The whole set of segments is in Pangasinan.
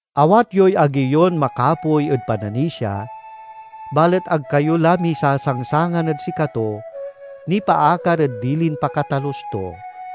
Awat yoy agi yon makapoy ed pananisia, balet ag kayo la misasangsangan ed sikato nipaakar ed dilin pakatalus to.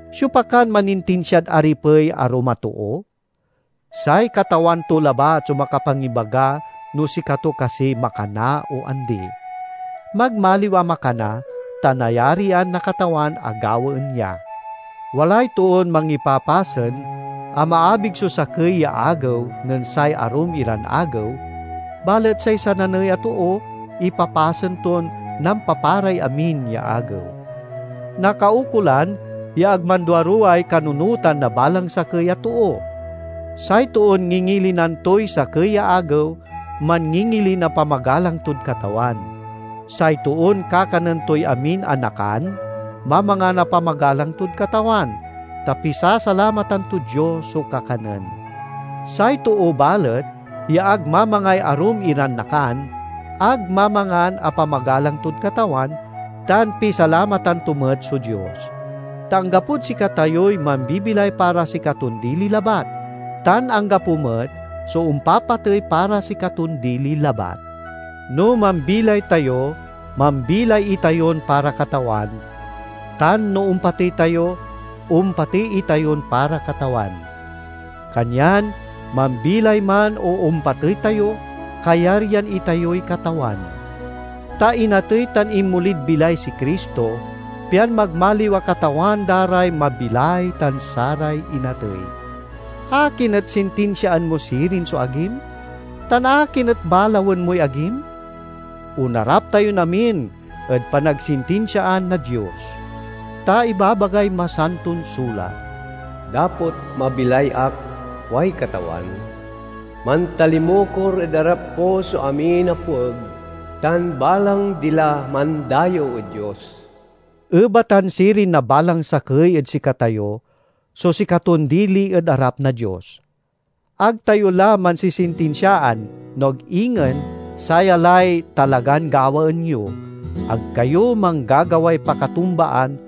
Siopa kan manintinsiad aripey arum a too? Say katawan to labat so makapangibaga no sikato kasiy makana o andi. Magmaliw a makana, ta nayarian na Katawan a gawaen ya. Walay toon mangipapasen a maabig so sakey ya agew nen say arum iran agew, balet say sananey a too ipapasen ton nampaparay amin ya agew. Nakaukolan ya ag manduaruway kanunotan na balang sakey a too. Say toon ngingilinan toy sakey ya agew, manngingilin a pamagalang tod Katawan; say toon kakanen toy amin a nakan, mamangan a pamagalang tod Katawan, ta pisasalamatan tod Dios so kakanen. Say too balet ya ag mamangay arum iran nakan, ag mamangan a pamagalang tod Katawan, tan pisalamatan to met so Dios. Ta anggapod sikatayoy mambibilay para sikaton dili labat, tan anggapo met so ompapatey para sikaton dili labat. No mambilay tayo mambilay itayon para Katawan, tan no ompatey tayo ompatey itayon para Katawan. Kanyan mambilay man o ompatey tayo, kayaryan itayoy Katawan. Ta inatey tan inmolid bilay si Cristo, pian magmaliw a Katawan da ray mabilay tan saray inatey. Akin et sintinsiaan mo sirin so agim? Tan akin et balawen moy agim? Onarap tayon amin ed panagsintinsiaan na Dios. Ta ibabagay Masanton Sulat, "Dapot mabilay ak, kuay Katawan, mantalimukor ed arap ko so amin a pueg tan balang dila mandayew ed Dios." Ebatan sirin na balang sakey ed sikatayo so sikaton dili ed arap na Dios. Ag tayo la mansisintinsiaan, no ag ingen saya lay talagan gawaen yo: ag kayo manggagaway pakatumbaan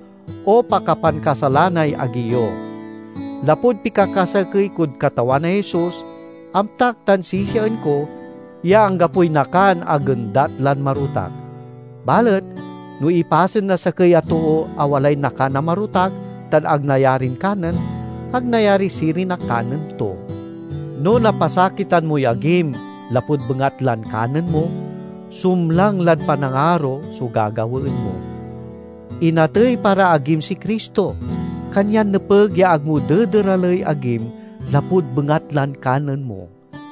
o pakapankasalanay agi yo. Lapud pikakasakey kod Katawan a Jesus, amtak tan sisiaen ko ya anggapoy nakan a gendat lan marotak. Balet no ipasen na sakey a too a walay nakan a marotak tan ag nayarin kanen, ag nayari sirin a kanen to. No napasakitan moy agim lapud bengatlan kanen mo, sumlang lad panangaro so gagawaen mo. Inatey para agim si Cristo, kanyan nepeg ya ag mo dederaley agim lapud bengatlan kanen mo!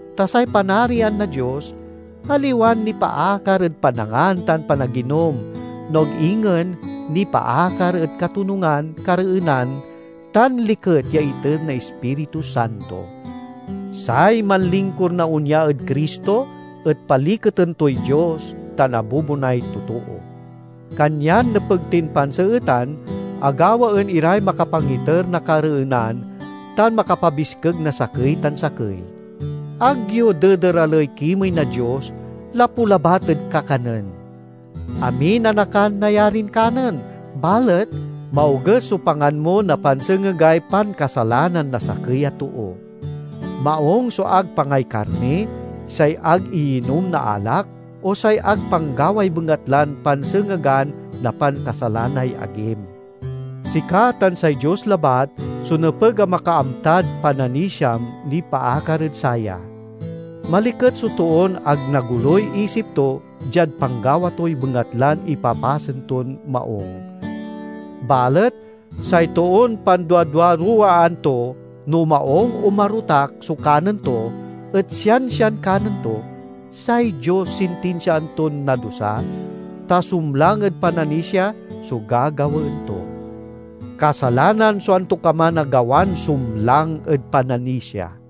Ta say Panarian na Dios aliwan nipaakar ed panangan tan panaginom, no ag ingen nipaakar ed katonungan, kareenan, tan liket ya iter na Ispiritu Santo. Say manlingkur na onya ed Cristo et paliketen toy Dios tan abubonay totoo. Kanyan nepeg tin panseetan a gawaen iray makapangiter na kareenan tan makapabiskeg na sakey tan sakey. Ag yo dederaley kimey na Dios lapu labat ed kakanen. Amin a nakan nayarin kanen, balet maoges so pangan mo na pansengegay pankasalanan na sakey a too. Maung so ag pangay karni, say ag iyinom na alak, o say ag panggaway bengatlan pansengegan na pankasalanay agim. Sika tan say Dios labat so nepeg a makaamtad pananisiam nipaakar ed saya. Maliket so toon ag nagoluy isip to diad panggawa toy bengatlan ipapasen ton maung! Balet say toon panduaduaruwaan to no maung a marotak so kanen to et siansian kanen to, say Dios sintinsiaan ton nadusa, ta sumlang ed pananisia so gagawaen to. Kasalanan so antokaman a gawan sumlang ed pananisia.